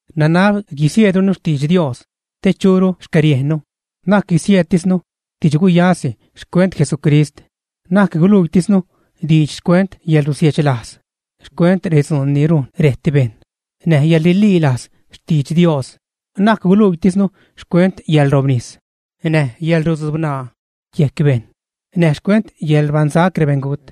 Nanab guisieedrunu xtidx Dios te churu xcäriejnnu. Na'c guisieedtisnu didx-guyasi xcuent Jesucrist. Na'c guluiitisnu diidx xcuent yäḻrusiechlajz, xcuent redzuun ni rujn rejt bejṉ, näj yäḻrililajz xtidx Dios. Na'c guluiitisnu xcuent yäḻrobnis, näj yäḻrudzubṉaa yejc bejṉ, näj xcuent yäḻrbajṉsac rebeṉgut,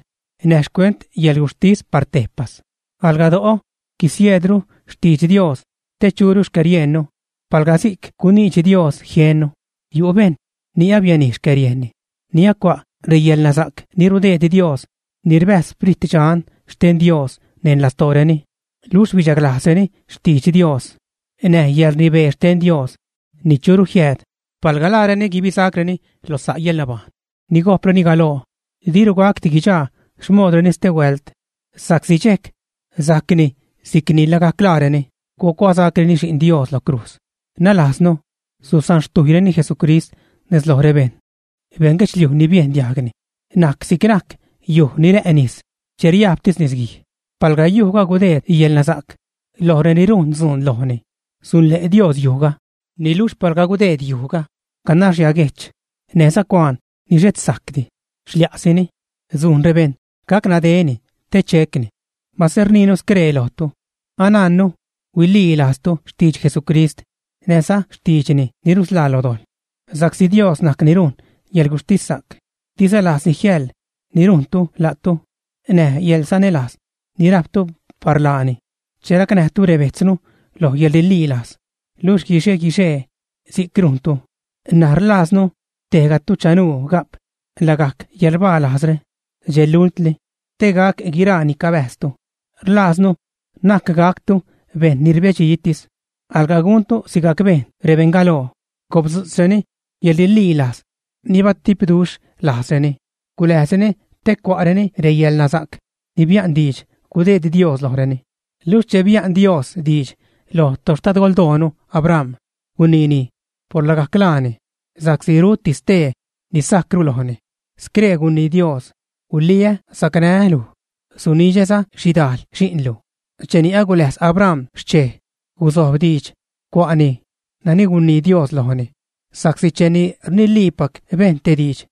näj xcuent yäḻguxhtis par tejpas. Alga do'o guisieedru xtidx Dios te churu xcäriejnnu, palga si'c guniidx Dios jiennu. Yu' bejṉ ni abianij xcäriejnni, ni acua' reyäḻnasa'c ni rudeed Dios, ni rbäjz Sprit Dxan xten Dios neṉ lastooreni, luxh bidxaglajzreni xtidx Dios näj yäḻrnibee xten Dios ni churu jiääd. Palga laareni guibisacreni lo sa' yäḻnabajṉ ni gojpreni galoo, diru gacdi guidxaa xmodreni stehuält, sa'csi dxejc sajcni si'c ni lagajc laareni gucuasacreni Xi'n Dios lo crujz, nalajznu susanxtujyreni Jesucrist nez loj rebejṉ. Beṉ guedxliuj ni biejn diajgni najc si'c najc yuj ni rä' nis che riajbtis nisguij. Palga yujga gudeed yälnasa'c loj reni rujn dzuun lojni, sunle' Dios yujga. Niluxh palga gudeed yujga ganax yaguejch näjza cuaan ni xhet sajcdi, xlia'sini, sujn rebejṉ gac nadeni te checni. Mase rniinu scree lojtu, anajnnu huililajztu xtidx Jesucrist näjza xtiidxni ni rusḻaa lo dojḻ. Sa'csi Dios najc ni rujn yäḻguxhtissa'c, diza lajzni jiäḻ ni rujntu la'tu näj yäḻsanälajz ni rajptu par laani che racnäjtu rebejtznu lo yäḻrililajz, luxh guixe-guixee si'c rujntu. N̲aj rlajznu tejgatu chanuu ga'p lagajc yäḻrbalajzre dxe lultli, te gac guiraa ni cabäjztu. Rlajznu na'c gactu bejṉ ni rbedxitis, alga guntu sigajc bejn rebeṉ galoo, gopdzu'tzreni yäḻrililajz ni batipduxh lajzreni, guläjzreni te cua'reni reyäḻnasa'c ni bia'n diidx gudeed Dios lojreni. Luxh che bia'n Dios diidx loj toxtadgoldoonu Abram, guniini por lagajc laani sa'csi ruti stee ni sajcru lojni. Scree gunii Dios: “Guliä sacnää́ luj, sunidxäza xhidajl xi'nlu.” Cheni aguläjz Abram xchej, gusojb diidx, cua'ni nani gunii Dios lojni. Sa'csi cheni rniliipac bejṉ te diidx,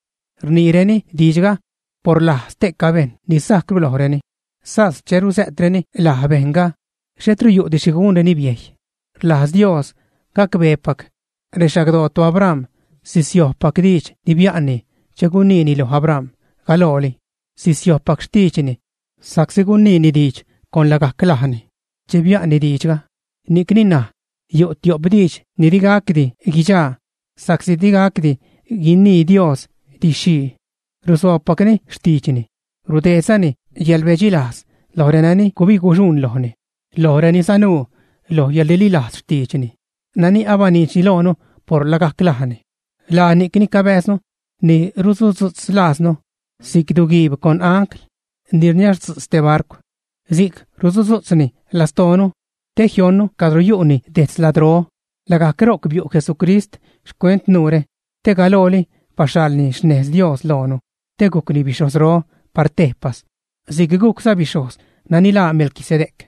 rniireni diidxga por laj ste'ca bejṉ ni sajcru lojreni, sas che rusä'treni laj bejṉga xhetru yu'di xhi gunreni biejy. Rlajz Dios gacbeepac rexagdoo toAbram sisiojbpac diidx ni bia'nni che guniini loj Abram galooli. Sisiojbpac xtiidxni, sa'csi guniini diidx con lagajc lajni che bia'nni diidxga. Ni'cni ṉaj yu' tiop diidx ni digacdi guichaa sa'csi digacdi guinii Dios didx-xhii, rusoobpacni xtiidxni, rudeedzani yäḻrbedxilajz loj renani gubig-guxuṉ lojni, loj reni sanuu loj yäḻrililajz xtiidxni nani abaniidxni loonu por lagajc lajni. Laa ni'cni cabääznu ni rusudzu'tz lajznu si'c duu-guiib con ancl ni rniazdzu'tz te barcw. Si'c rusudzu'tzni lastoonu te jionnu cadro yu'ni detz ladró. Lagajc ro'c biu' Jesucrist xcuent nuure, te galooli baxhalni xnez Dios loonu, te gujcni bixhojzro par tejpas si'c gujcza bixhojz nani laa Melquisedec.